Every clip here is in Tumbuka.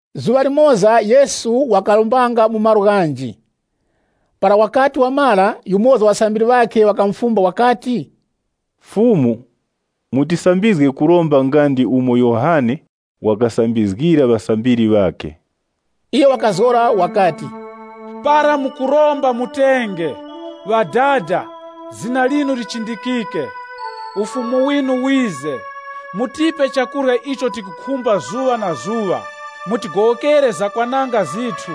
Zuŵa limoza Yesu wakarombanga mu malo ghanji. Para wakati wamara, yumoza wa ŵasambiri ŵakhe wakamufumba wakati, “Fumu, mutisambizge kuromba nga ndi umo Yohane wakasambizgira ŵasambiri ŵakhe.” Iyo wakazgora wakati, “Para mukuromba mutenge, ‘Ŵadada, Zina linu lichindikike, Ufumu winu wize. Mutipe chakurya icho tikukhumba zuŵa na zuŵa. Mutigowokere zakwananga zithu,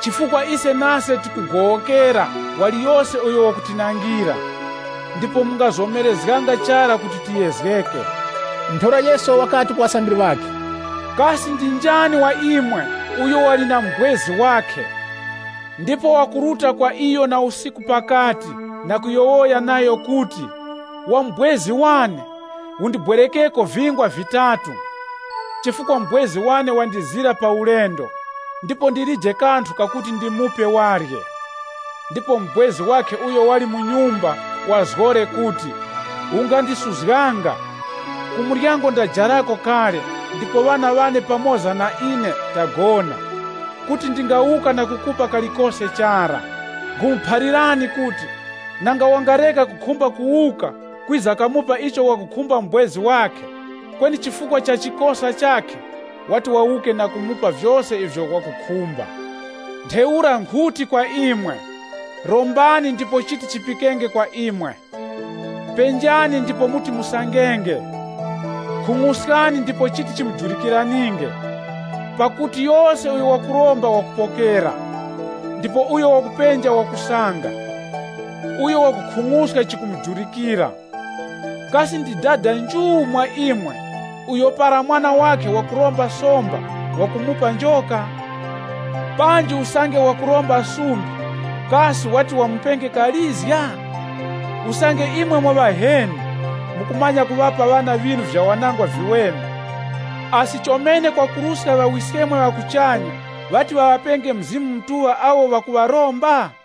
chifukwa ise nase tikugowokera waliyose uyo wakutinangira. Ndipo mungatitoreranga mu kuyezgeka.’” Ntheura Yesu wakati ku ŵasambiri ŵakhe, “Kasi ndi njani wa imwe uyo wali na mubwezi wakhe, ndipo wakuruta kwa iyo na usiku pakati na kuyowoya nayo kuti, ‘Wa mubwezi wane, undibwerekeko vingwa vitatu, chifukwa mubwezi wane wandizira pa ulendo, ndipo ndilije kanthu kakuti ndimupe warye.’ Ndipo mubwezi wakhe uyo wali mu nyumba wazgore kuti, ‘Ungandisuzganga. Ku muryango ndajarako kale ndipo ŵana ŵane pamoza na ine tagona. Kuti ndingawuka na kukupa kalikose chara.’ Nkhumuphalirani kuti, nanga wangareka kukhumba kuwuka kwiza kamupa icho wakukhumba mubwezi wakhe, kweni chifukwa cha chikosa chakhe, wati wawuke na kumupa vyose ivyo wakukhumba. “Ntheura nkhuti kwa imwe: Rombani ndipo chiti chipikenge kwa imwe. Penjani ndipo muti musangenge. Khung'uskani ndipo chiti chimujurikiraninge. Pakuti yose uyo wakuromba wakupokera, ndipo uyo wakupenja wakusanga, uyo wakukhung'uska chikumujurikira. Kasi ndi dada nju mwa imwe uyo para mwana wakhe wakuromba somba wakumupa njoka? Panji usange wakuromba sumbi, kasi wati wamupe kalizga? Usange imwe mwa ŵaheni, mukumanya kuŵapa ŵana ŵinu vyawanangwa viweme, asi chomene kwakuruska Ŵawiskemwe ŵa kuchanya ŵati ŵaŵapenge Mzimu Mutuŵa awo ŵakuŵaromba?”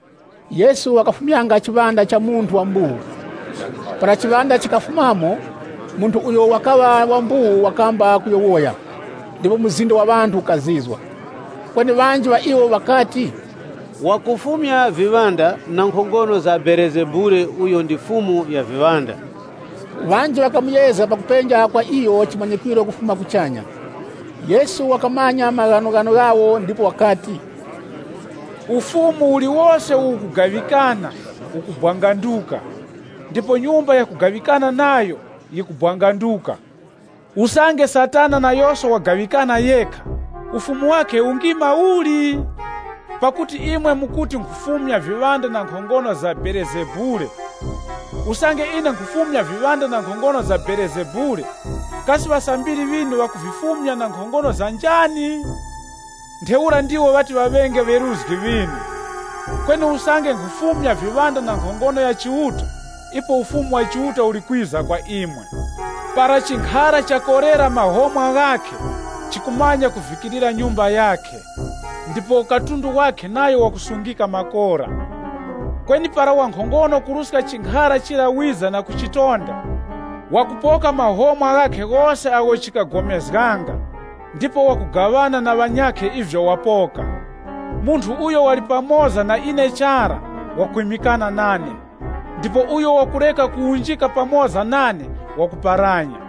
Yesu wakafumyanga chiŵanda cha munthu wa mbuwu. Para chiŵanda chikafumamo, munthu uyo wakaŵa wa mbuwu wakamba kuyowoya, ndipo mzinda wa ŵanthu wukazizwa. Kweni ŵanji ŵa iwo ŵakati, “Wakufumya viŵanda na nkhongono za Belezebule uyo ndi mukuru wa viŵanda.” Ŵanji ŵakamuyezga na kupenja kwa iyo chimanyikwiro kufuma kuchanya. Yesu wakamanya maghanoghano ghawo ndipo wakati, Ufumu uliwose uwo ukugaŵikana, ukubwanganduka, ndipo nyumba yakugaŵikana nayo, yikubwanganduka. Usange Satana nayoso wagaŵikana yekha, ufumu wakhe ungima uli? Pakuti imwe mukuti nkhufumya viŵanda na nkhongono za Belezebule. Usange ine nkhufumya viŵanda na nkhongono za Belezebule, kasi ŵasambiri ŵinu ŵakuvifumya na nkhongono za njani? Ntheura ndiwo ŵati ŵaŵenge ŵeruzgi ŵinu. Kweni usange nkhufumya viŵanda na nkhongono ya Chiuta, ipo Ufumu wa Chiuta uli kwiza kwa imwe. “Para chinkhara chakorera mahomwa ghakhe, chikumanya kuvikirira nyumba yakhe, ndipo katundu wakhe nayo wakusungika makora. Kweni para wankhongono kuruska chinkhara chira wiza na kuchitonda, wakupoka mahomwa ghakhe ghose agho chikagomezganga ndipo wakugaŵana na ŵanyakhe ivyo wapoka. “Munthu uyo wali pamoza na ine chara, wakwimikana nane. Ndipo uyo wakureka kuwunjika pamoza nane wakuparanya.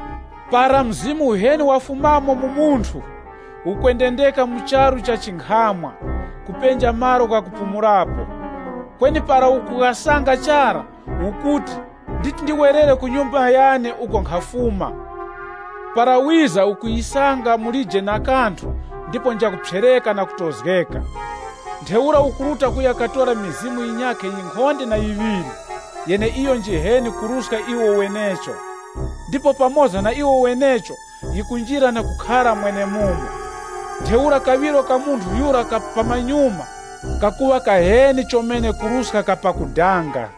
“Para mzimu uheni wafumamo mu munthu, ukwendendeka mu charu cha chinkhamwa, kupenja malo ghakupumulapo, kweni para ukughasanga chara, ukuti, ‘Nditi ndiwerere ku nyumba yane uko nkhafuma.’ Para wiza ukuyisanga mulije na kanthu ndipo njakuphyereka na kutozgeka. Ntheura ukuruta kuya katora mizimu yinyakhe yinkhonde na yiŵiri, yeneiyo njiheni kuruska iwo wenecho. Ndipo pamoza na iwo wenecho yikunjira na kukhara mwenemumo. Ntheura kaŵiro ka munthu yura ka pamanyuma, kakuŵa kaheni chomene kuruska ka pakudanga.”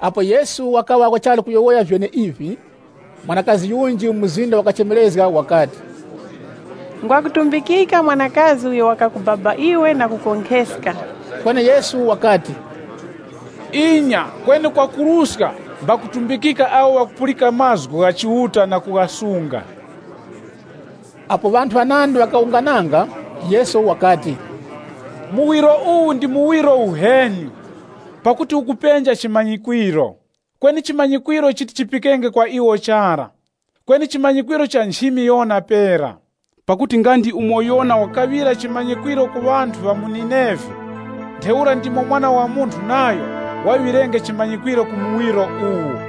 Apo Yesu wachali kuyowoya vyeneivi, mwanakazi yunji mu mzinda wakachemerezga wakati, “Ngwakutumbikika mwanakazi uyo wakakubaba iwe na kukonkheska!” Kweni Yesu wakati, “Inya, kweni kwakuruska mbakutumbikika awo ŵakupulika mazgu gha Chiuta na kughasunga.” Apo ŵanthu ŵanandi ŵakawungananga, Yesu wakati, “Muwiro uwu ndi muwiro uheni, pakuti ukupenja chimanyikwiro. Kweni chimanyikwiro chiti chipikenge kwa iwo chara, kweni chimanyikwiro cha nchimi Yona pera. Pakuti nga ndi umo Yona wakaŵira chimanyikwiro ku ŵanthu ŵa mu Nineve, ntheura ndimo Mwana wa Munthu nayo waŵirenge chimanyikwiro ku muwiro uwu.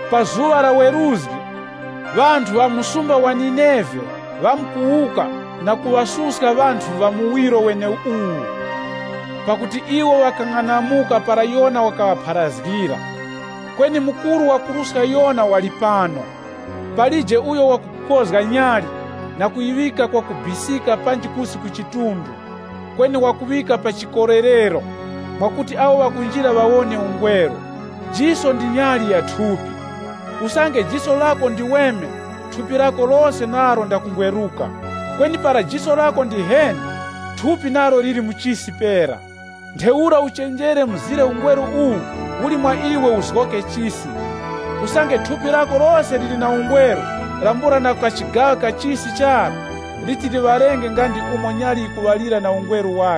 Pa zuŵa la weruzgi, ŵanthu ŵa mu msumba wa Nineve ŵamkuwuka na kuŵasuska ŵanthu ŵa muwiro weneuwu, pakuti iwo ŵakang'anamuka para Yona wakaŵapharazgira. Kweni mukuru wakuruska Yona wali pano.” “Kweni palije uyo wakukozga nyali, na kuyiŵika kwakubisika panji kusi ku chidunga, kweni wakuŵika pa chikolerero, mwakuti awo ŵakunjira ŵawone ungweru. Jiso ndilo nyali ya thupi, usange jiso lako ndiweme, thupi lako lose nalo ndakungweruka. Kweni para jiso lako ndiheni, thupi nalo liri mu chisi pera. Ntheura uchenjere mzire ungweru uwo uli mwa iwe uzgoke chisi. Usange thupi lako lose liri na ungweru, lambula na kachigaŵa ka chisi chara, liti liŵalenge nga ndi umo nyali na marazi ghakhe yikukupira ungweru.”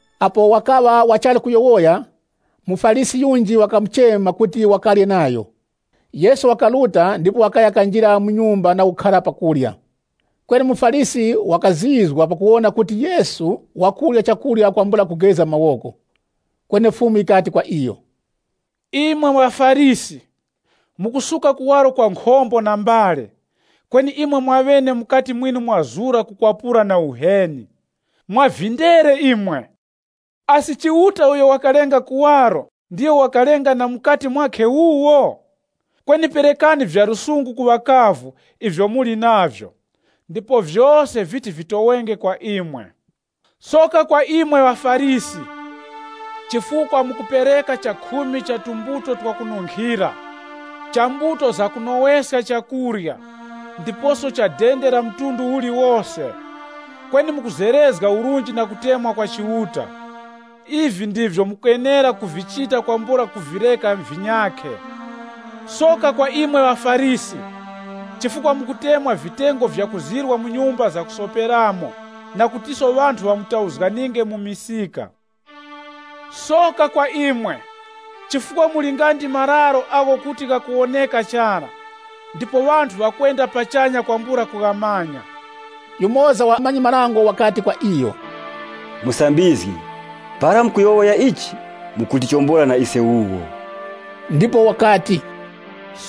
Apo wakaŵa wachali kuyowoya, muFarisi yunji wakamuchema kuti wakarye nayo. Yesu wakaruta ndipo wakaya kanjira mu nyumba na kukhara pa kurya. Kweni muFarisi wakazizwa pakuwona kuti Yesu wakurya kwambula kugeza mawoko. Kweni Fumu yikati kwa iyo, Imwe ŵaFarisi, mukusuka kuwaro kwa nkhombo na mbale, kweni imwe mwaŵene mukati mwinu mwazura kukwapura na uheni. Mwavindere imwe! Asi Chiuta uyo wakalenga kuwaro ndiyo wakalenga na mukati mwakhe wuwo? Kweni perekani vya lusungu ku ŵakavu ivyo muli navyo, ndipo vyose viti vimutoweraninge. “Soka kwa imwe ŵaFarisi! Chifukwa mukupereka chakhumi cha tumbuto twakununkhira, cha mbuto zakunoweska chakurya, ndiposo cha dende la mtundu uliwose. Kweni mukuzerezga urunji na kutemwa kwa Chiuta. Ivi ndivyo mukenera kuvichita kwambula kuvireka vinyakhe. “Soka kwa imwe ŵaFarisi! Chifukwa mukutemwa vitengo vyakuzirwa mu nyumba zakusoperamo na kutiso ŵanthu ŵamutauzganinge mu misika. Soka kwa imwe! Chifukwa muli nga ndi mararo agho kuti ghakuwoneka chara, ndipo ŵanthu ŵakwenda pachanya kwambula kughamanya.” Yumoza wa ŵamanyi-marango wakati kwa iyo, “Musambizgi, para mukuyowoya ichi, mukutichombola na ise wuwo.” Ndipo wakati,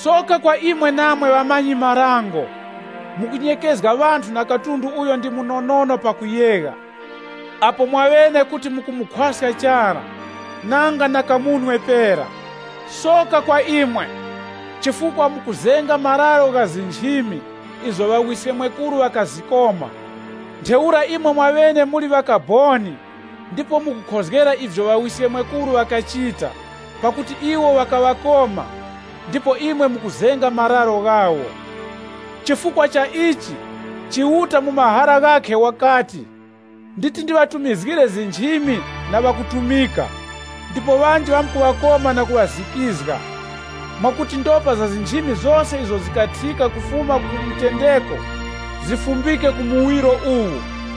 “Soka kwa imwe namwe ŵamanyi-marango! Mukunyekezga ŵanthu na katundu uyo ndi munonono pakuyegha, apo mwaŵene kuti mukumukhwaska chara, nanga na kamunwe pera. Soka kwa imwe! Chifukwa mukuzenga mararo gha nchimi, izo ŵawiskemwekuru ŵakazikoma. Ntheura imwe mwaŵene muli ŵakaboni ndipo mukukhozgera ivyo ŵawiskemwekuru ŵakachita. Pakuti iwo ŵakaŵakoma, ndipo imwe mukuzenga mararo ghawo. Chifukwa cha ichi, Chiuta mu mahara ghakhe wakati, ‘Nditi ndiŵatumizgire nchimi na ŵakutumika ndipo ŵanji ŵamkuŵakoma na kuŵazikizga.’ Mwakuti ndopa za nchimi zose izo zikathika kufuma ku mutendeko, zifumbike ku muwiro uwu,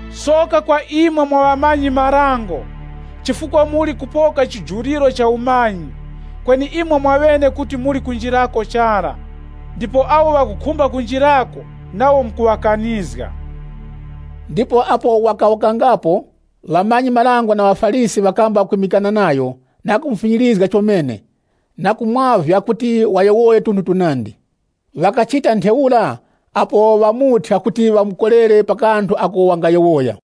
“Soka kwa imwe mwa ŵamanyi-marango! Chifukwa muli kupoka chijuriro cha umanyi, kweni imwe mwaŵene kuti muli kunjirako chara, ndipo awo ŵakukhumba kunjirako nawo mukuŵakanizga.” Ndipo apo wakawukangapo, ŵamanyi-marango na ŵaFarisi ŵakamba kwimikana nayo na kumufinyirizga chomene, ndiposo na kumwavya kuti wayowoye tunthu tunandi. Ŵakachita ntheura, apo ŵamuthya kuti ŵamukorere pa kanthu ako wangayowoya.